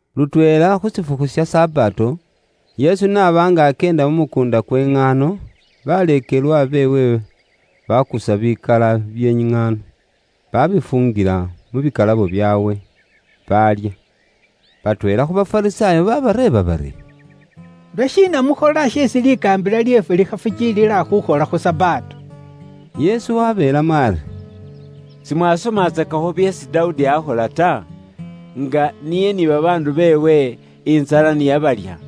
Lutweela khu shifukhu sha Sabato, Yesu n'aba nga akyeenda mu mukuunda kwe iŋaano, baleekelwa beewe bakusa bikala bye iŋaano, babifuungila mu bikalabo byaabwe, baalya. Batweela khu Bafarisaayo baabareeba bari, “Lwashiina mukhola sheesi likaambila lyeefwe likhafukiilila khuukhola khu Sabato?” Yesu waabeelamo ari, “Simwasomatsakakho byeesi Dawudi aakhola ta? Nga niye ni babaandu beewe, intsala ni yabalya?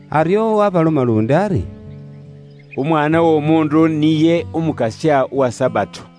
Aryo waabaloma luundi ari, “Umwaana w'Omuundu niye Umukasya uwa Sabato.”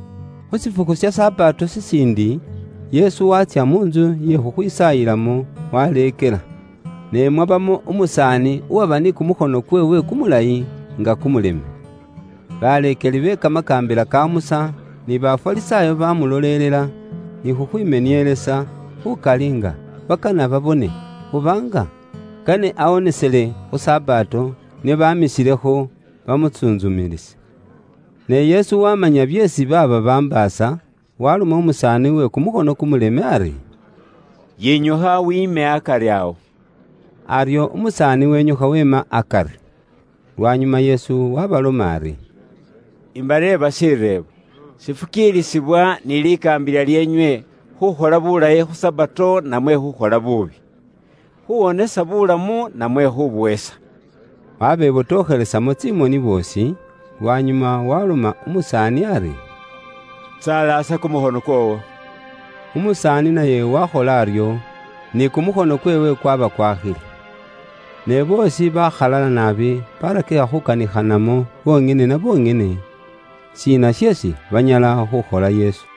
Khu shifukhu sha Sabato shishiindi, Yesu waatsya mu ntsu iye khukhwisaayilamo waleekela. Ne mwabamo umusaani uwaba ni kumukhono kweewe kumulayi nga kumuleme. Baleekeli be kamakaambila ka Musa, ni Bafarisaayo bamulolelela ni khukhwimenielesa khukali nga bakana babone oba nga kane awonesele khu Sabato, nio bamisilekho bamutsuntsumilise. Ne Yesu wamanya byeesi baaba bambaasa, waloma umusaani uwe kumukhono kumuleme ari, “Yinyukha wiime akari awo.” Aryo umusaani wenyukha weema akari. Lwanyuma Yesu waabaloma ari, “Imbareeba shireebo; shifukiilisibwa ni likaambila lyeenywe khukhola buulayi khu Sabato namwe khukhola buubi? Khuwonesa buulamu namwe khubuhesa?” Wabebotokhelesamo tsimoni boosi, lwanyuma waloma umusaani ari, “Tsalaasa kumukhono kwoowo.” Umusaani naye wakhola aryo, ni kumukhono kweewe kwaba kwakhile. Ne boosi bakhalala naabi, barakikha khukanikhanamo bonyene na bonyene, shiina sheesi banyala khukhola Yesu.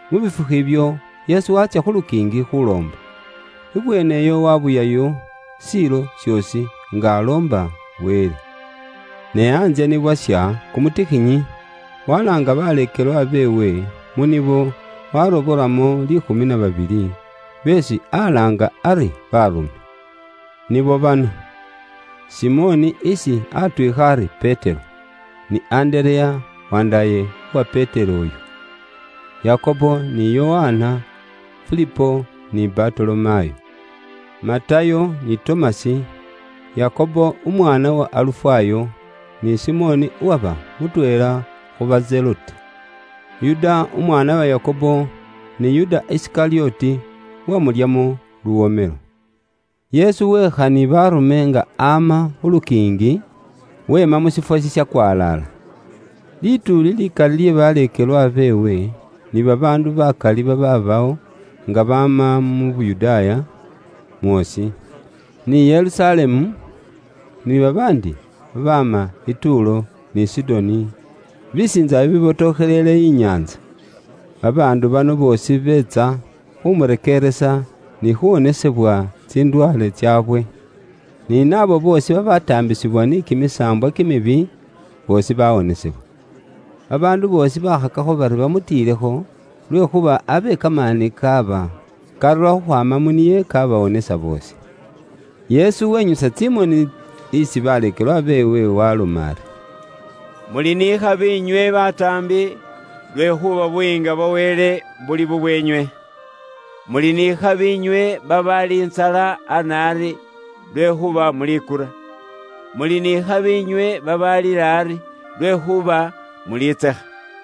Mu bifukhu ibyo, Yesu waatsya khu lukiingi khuloomba. Ibweene iyo wabuyayo shiilo shoosi nga aloomba Wele. Ne antsye ni bwasha kumutikhinyi, walaanga baleekelwa beewe, mu nibo warobolamo liikhumi na babili, beesi alaanga ari baarume. Nibo bano: Simoni isi atwiikha ari Petero, ni Andereya wandaaye uwa Petero oyo, Yakobo ni Yokana, Filipo ni Batolomayo, Matayo ni Tomasi, Yakobo umwaana wa Alufayo, ni Simoni uwaba mutweela khuba Zelote, Yuda umwaana wa Yakobo, ni Yuda Isikalyoti uwamulyamo luwomelo. Yesu weekha ni baarume nga ama khu lukiingi, weema mu shiifwo shishakwalaala. Lituuli likali lye baleekelwa beewe, ni babaandu bakali babaabawo nga baama mu Yuda mwoosi, ni Yerusalemu, ni babaandi babaama i Tuulo ni Sidoni, bisiintsa bibibotokhelele inyaantsa. Babaandu bano boosi beetsa khumurekeeresa ni khuwonesebwa tsindwaale tsaabwe. Ni naabo boosi babataambisibwa ni kimisaambwa kimibi, boosi bawonesebwa. Babaandu boosi bakhakakho bari bamutiilekho lwekhuuba abe kamaani kaaba karura khukhwaama mu niye kabawonesa boosi. Yesu wenyusa tsimoni isi baleekelwa beewe waaloma ari: “Muli ni ikhabi inywe bataambi, lwekhuuba Buyiinga bwa Wele buli bubweenywe. “Muli ni ikhabi inywe babaali intsala ana ari, lwekhuuba mulikura. Muli ni khabi inywe babaalila ari, lwekhuuba mulitsekha.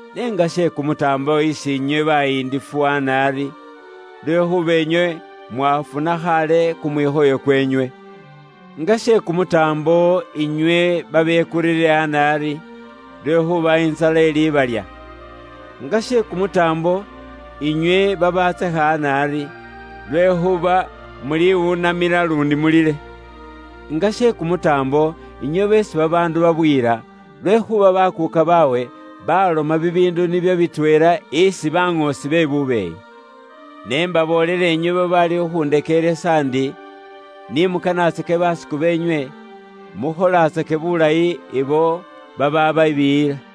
“N'enga she kumutaambo isi inywe bayindifu ana ari, lwekhuuba inywe mwafuna khaale kumwikhoyo kweenywe. “Nga she kumutaambo inywe babekurire ana ari, lwekhuuba intsala ilibalya. Nga she kumutaambo inywe babatsekha ana ari, lwekhuuba muli wunamila luundi mulile. “Nga she kumutaambo inywe beesi babaandu babuyila, lwekhuuba bakuuka baabwe baloma bibiindu nibyo bitweela isi baŋoosi be bubeeyi. “Ne imbaboolela inywe babaali khukhundekeeresa ndi, ni mukanaatsake basiku beenywe, mukholatsake bulayi ibo babababiiyiila.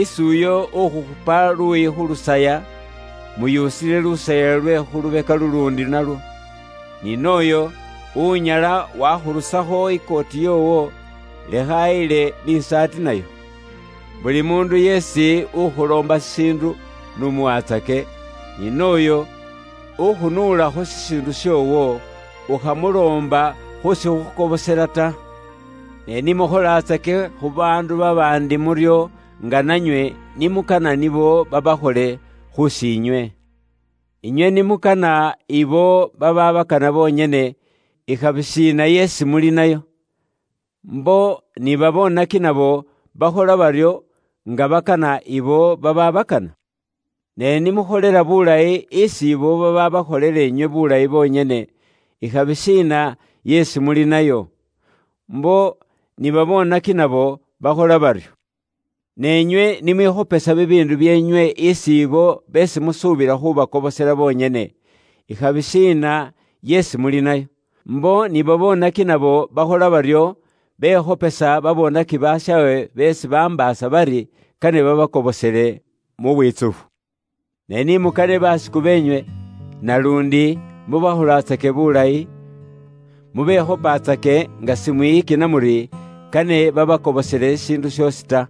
Isi uyo ukhukhupa luuyi khu lusaya, muyusile lusaya lwe khu lubeka luluundi nalwo. Ni n'oyo unyala wakhurusakho ikooti yoowo, lekha ayile ni isaati nayo. Buli muundu yeesi ukhuloomba shishiindu, n'umuwaatsake, ni nooyo ukhunuulakho shishiindu shoowo, ukhamuloomba khu shikhukobosela ta. Ne ni mukholatsake khu baandu babaandi muryo nga nanywe ni mukana nibo babaakhole khuusi inywe. “Inywe ni mukana ibo babakana bonyene, ikhabi shiina yeesi muli nayo? Mbo ni baboonaki nabo bakhola baryo nga bakana abo babaabakana. Ne ni mukholela buulayi isi ibo babaakholela inywe buulayi bonyene, ikhabi shiina yeesi muli nayo? Mbo ni babonaki nabo bakhola baryo. Ne inywe ni mwikhopesa bibiindu byeenywe isi ibo beesi musuubila khubakobosela bonyene, ikhabi shiina yeesi muli nayo? Mbo ni babonaki nabo bakhola baryo, bekhopesa babonaki bashaawe beesi bambaasa bari kane babakobosele mu bwitsufu. Ne ni mukanaatsake basiku beenywe, naluundi mubakholatsake buulayi, mubekhopatsake nga simwiyikina muri, kane babakobosele shishiindu shoosi ta.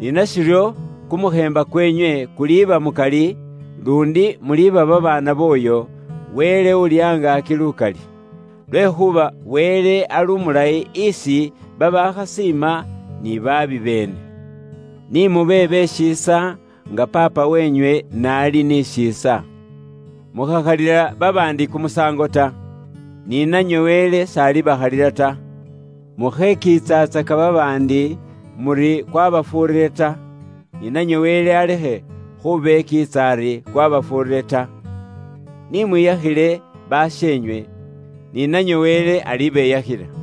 Ni nashiryo, kumukheemba kweenywe kuliba mukali, luundi muliba babaana booyo, Wele Uuli Angaaki Lukali. Lwekhuuba Wele ali umulayi isi babaakhasiima ni baabi beene. Nimube be shiisa nga Paapa weenywe n'ali ni shiisa. “Mukhakhalila babaandi kumusaango ta, ni nanywe Wele s'alibakhalila kumusaango ta. Mukhekiitsatsaka babaandi muri kwabafuurire ta, ni nanywe Wele alekhe khubekiitsa ari kwabafuurire ta. Ni mwiyakhile basheenywe, ni nanywe Wele alibeyakhila.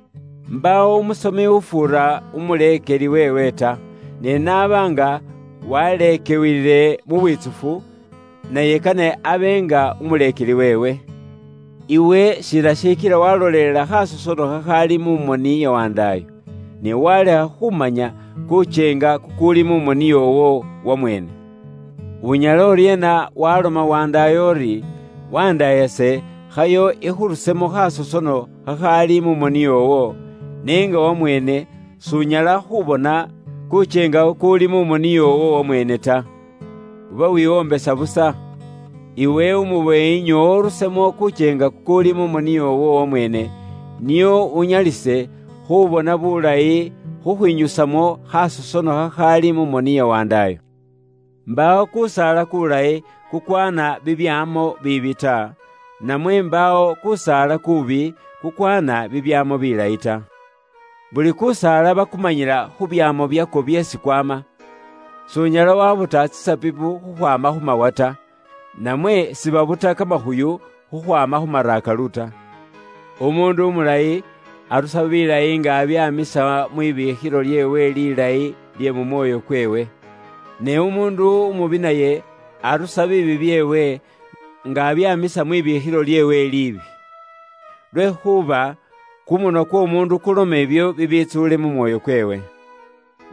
Mbaawo umuleekelwa ufuura umuleekeli weewe ta, ne n'aba nga waleekiwiile mu bwitsufu, naye kane abe nga umuleekeli weewe.” “Iwe shiina shikila walolelela khasosono khakhaali mu moni ya wandaayo, ne walekha khumanya kukyeenga kukuuli mu moni yoowo wamweene? Unyala uryeena waloma wandaayo uri, ‘Wandaayase khayo ikhurusemo khasosono khakhaali mu moni yoowo,’ n'enga wamweene s'unyala khubona kukyeenga kukuuli mu moni yoowo wamweene ta? Uba wiwombesa busa. Iwe umubeeyi nyoowa urusemo kukyeenga kukuuli mu moni yoowo wamweene, nio unyalise khubona bulayi khukhwinyusamo khasosono khakhaali mu moni ya wandaayo.” “Mbaawo kusaala kulayi kukwaana bibyaamo biibi ta, namwe mbaawo kusaala kuubi kukwaana bibyaamo bilayi ta. Buli kusaala bakumanyila khu byaamo byakwo byeesi kwama. S'unyala wabuta tsisabibu khukhwaama khu mawa ta, namwe sibabuta kamakhuyu khukhwaama khu marakalu ta. Umuundu umulayi arusa bilayi nga abyaamisa mwibiikhilo lyeewe lilayi lye mu mwoyo kweewe. Ne umuundu umubi naye arusa biibi byeewe nga abyaamisa mwibiikhilo lyeewe liibi. Lwekhuuba kumunwa kw'omuundu kuloma ibyo bibitsuule mu mwoyo kweewe.”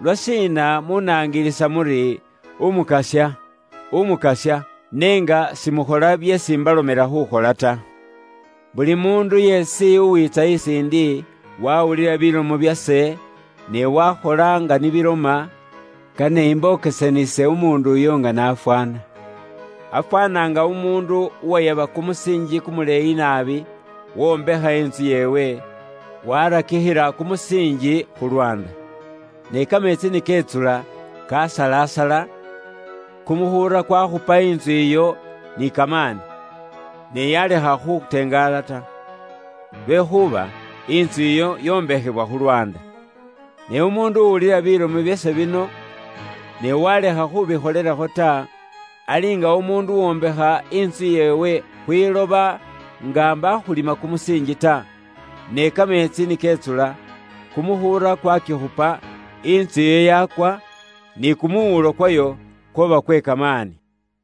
“Lwashiina munangilisa muri, ‘Umukasya, Umukasya’, ne nga simukhola byeesi mbalomela khukhola ta? Buli muundu yeesi uwiitsa isiindi, wawulila bilomo byase, ne wakhola nga ni biloma, kane imbokesanise umuundu uyo nga nafwaana: afwaana nga umuundu uwayaba kumusiinji kumuleeyi naabi, wombekha intsu yeewe, warakikhila kumusiinji khu lwaanda. Ne kameetsi ni ketsula kasalasala, kumukhuura kwakhupa intsu iyo ni kamaani, ne yalekha khutengaala ta, lwekhuuba intsu iyo yombakhiwa khu lwaanda. Ne umuundu uwulila bilomo byase bino, ne walekha khubikholelakho ta, ali nga umuundu uwombekha intsu yeewe khwiloba nga mbakhulima kumusiinji ta, ne kameetsi ni ketsula, kumukhuura kwakikhupa, intsu iyo yakwa, ni kumuwuulo kwayo kwaba kwe kamaani!”